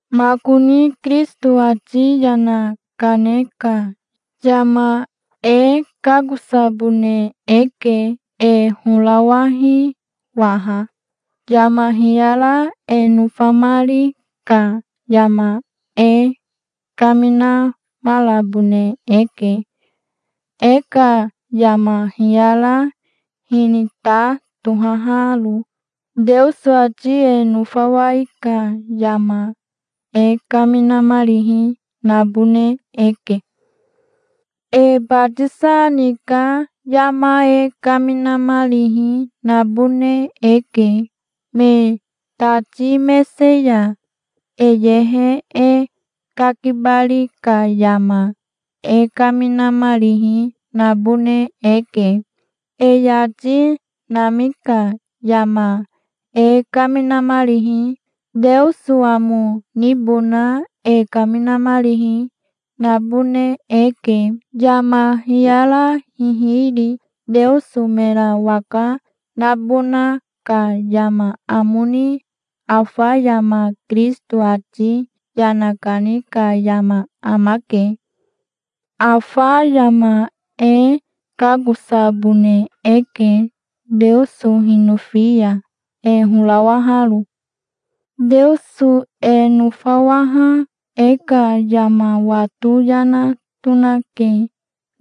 Makoni Kirisito ati yana kane ka yama e kakosabone eke. E horawahi waha. Yama hiyara e nofamari ka yama e kaminamarabone eke, e ka yama hiyara, hinita tohaharo. Teoso ati e nofawai ka yama e kaminamarihi nabone eke. E batisa ni ka yama e kaminamarihi nabone eke. Me tati mese ya e yehe e kakibari ka yama e kaminamarihi nabone eke. E yati nami ka yama e kaminamarihi, Teoso amo nibona e kaminamarihi, nabone eke, yama hiyara hihiri Teoso mera waka nabona ka yama amo ni. Afa yama Kirisito ati yana kani ka yama amake. Afa yama e kakosabone eke, Teoso hinofi ya, e horawaharo. Teoso e nofawaha e ka yama wato yana tonake.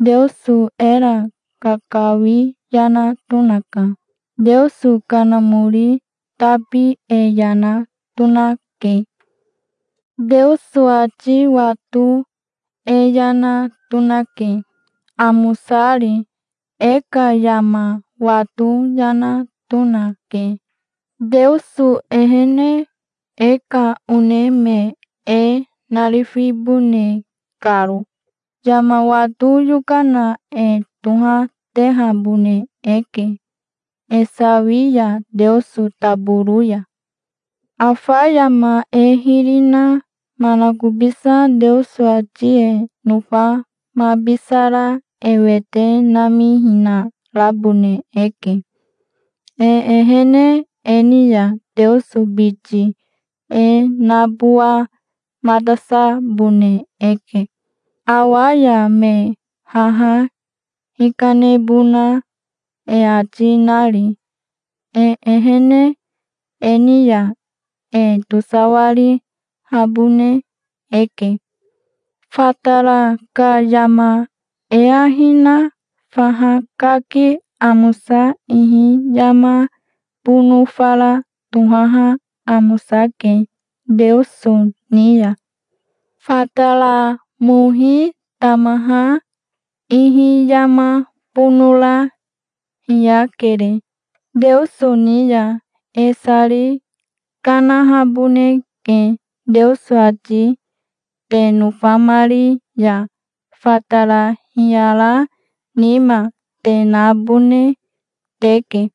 Teoso era kakawi yana tonaka. Teoso Kanamori tabi e yana tonake. Teoso ati wato e yana tonake, amosari. E ka yama wato yana tonake, Teoso ehene, e ka one me e narifibone karo. Yama wato yokana e tohatehabone eke, e sawi ya Teoso taboro ya. Afa yama e hiri na manakobisa Teoso ati e nofamabisara e wete namihinarabone eke. E ehene e ni ya Teoso biti e nabowamatasabone eke awa ya, me haha hikanebona e ati nari. E ehene e ni ya e tosawarihabone eke. Fatara ka yama e ahi na faha kaki amosa ihi yama bono fara tohaha amosake Teoso ni ya. Fatara mohi tamaha ihi yama bonora hiyakere Teoso ni ya. E sari kanahaboneke. Teoso ati te nofamari ya fatara hiyara nima te nabone teke.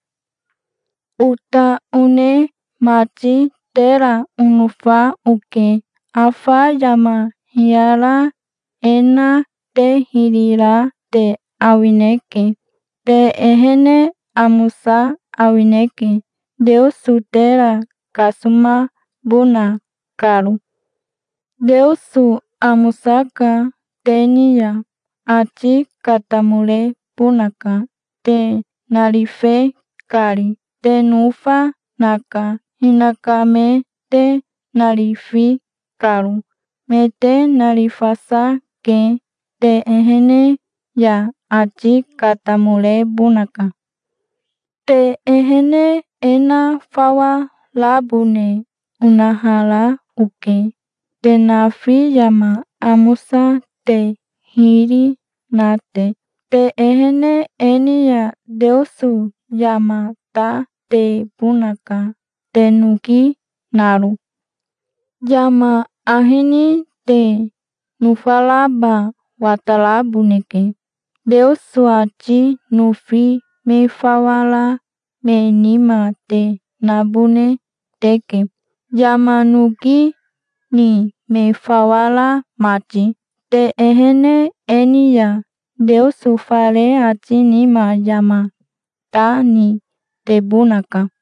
Ota one mati, tera onofa oke. Afa yama hiyara e na te hiri ra te awineke. Te ehene amosa awineke, Teoso tera kasomabona karo. Teoso amosaka. Te ni ya ati katamorebonaka, te narife kari. Te nofa naka, hinaka me te narifi karo. Me te narifasa ke. Te ehene ya ati katamorebonaka. Te ehene e na fawa rabone onahara oke, te nafi, yama amosa te hiri na te. Te ehene e ni ya Teoso yama ta tebonaka te noki naro. Yama ahi ni te nofaraba wataraboneke. Teoso ati nofi me fawa ra me nima te nabone teke, yama noki ni me fawa ra mati. Te ehene e ni ya Teoso fare ati nima yama ta ni tebonaka.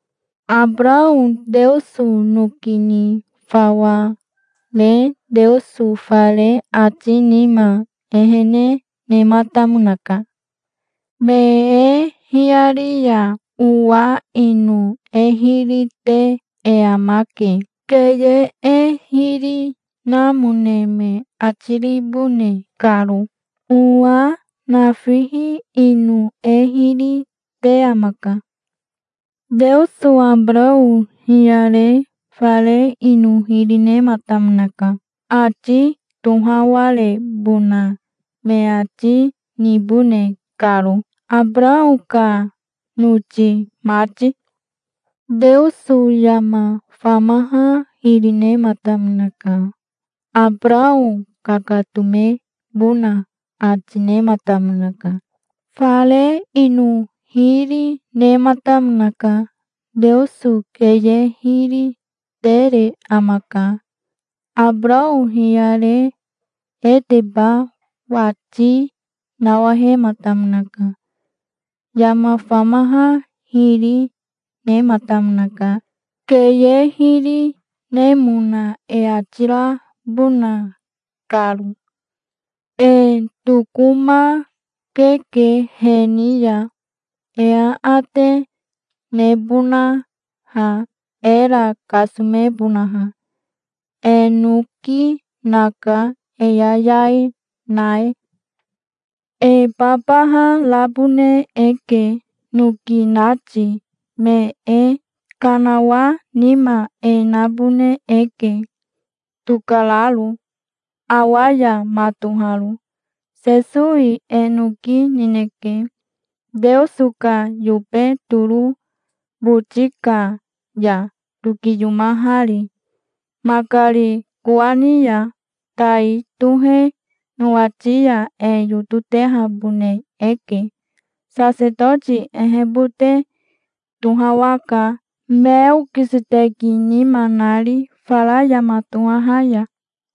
Abarao Teoso noki ni fawa re Teoso fare ati nima ehene nematamonaka. Me e hiyari ya owa ino e hiri te e amake, keye e hiri namone me ati ribone karo. Owa nafihi ino e hiri te amaka. Teoso Abarao hiyare fare ino hiri nematamonaka, ati tohawarebona me ati nibone karo, Abarao ka noti mati. Teoso yama famaha hiri nematamonaka. Abarao kakatomebona ati nematamonaka. Fare ino hiri, nematamonaka. Teoso keye hiri tere amaka. Abarao hiyare eteba wati nawahematamonaka. Yama famaha hiri nematamonaka, keye hiri nemona e ati rabona karo. E tokomakeke he ni ya, e aate nebonaha, era kasomebonaha. E noki naka e yayai na e. E babaha rabone eke, noki nati me e. Kanawa nima e nabone eke, tokararo, awa ya matoharo. Sesowi e noki nineke, Teoso ka yobe toro boti ka ya tokiyomahari, makari kowani ya. Tai tohe nowati ya e yototehabone eke. Sasetoti ehebote tohawaka, Meokiseteki nima nari, fara yama tohaha ya.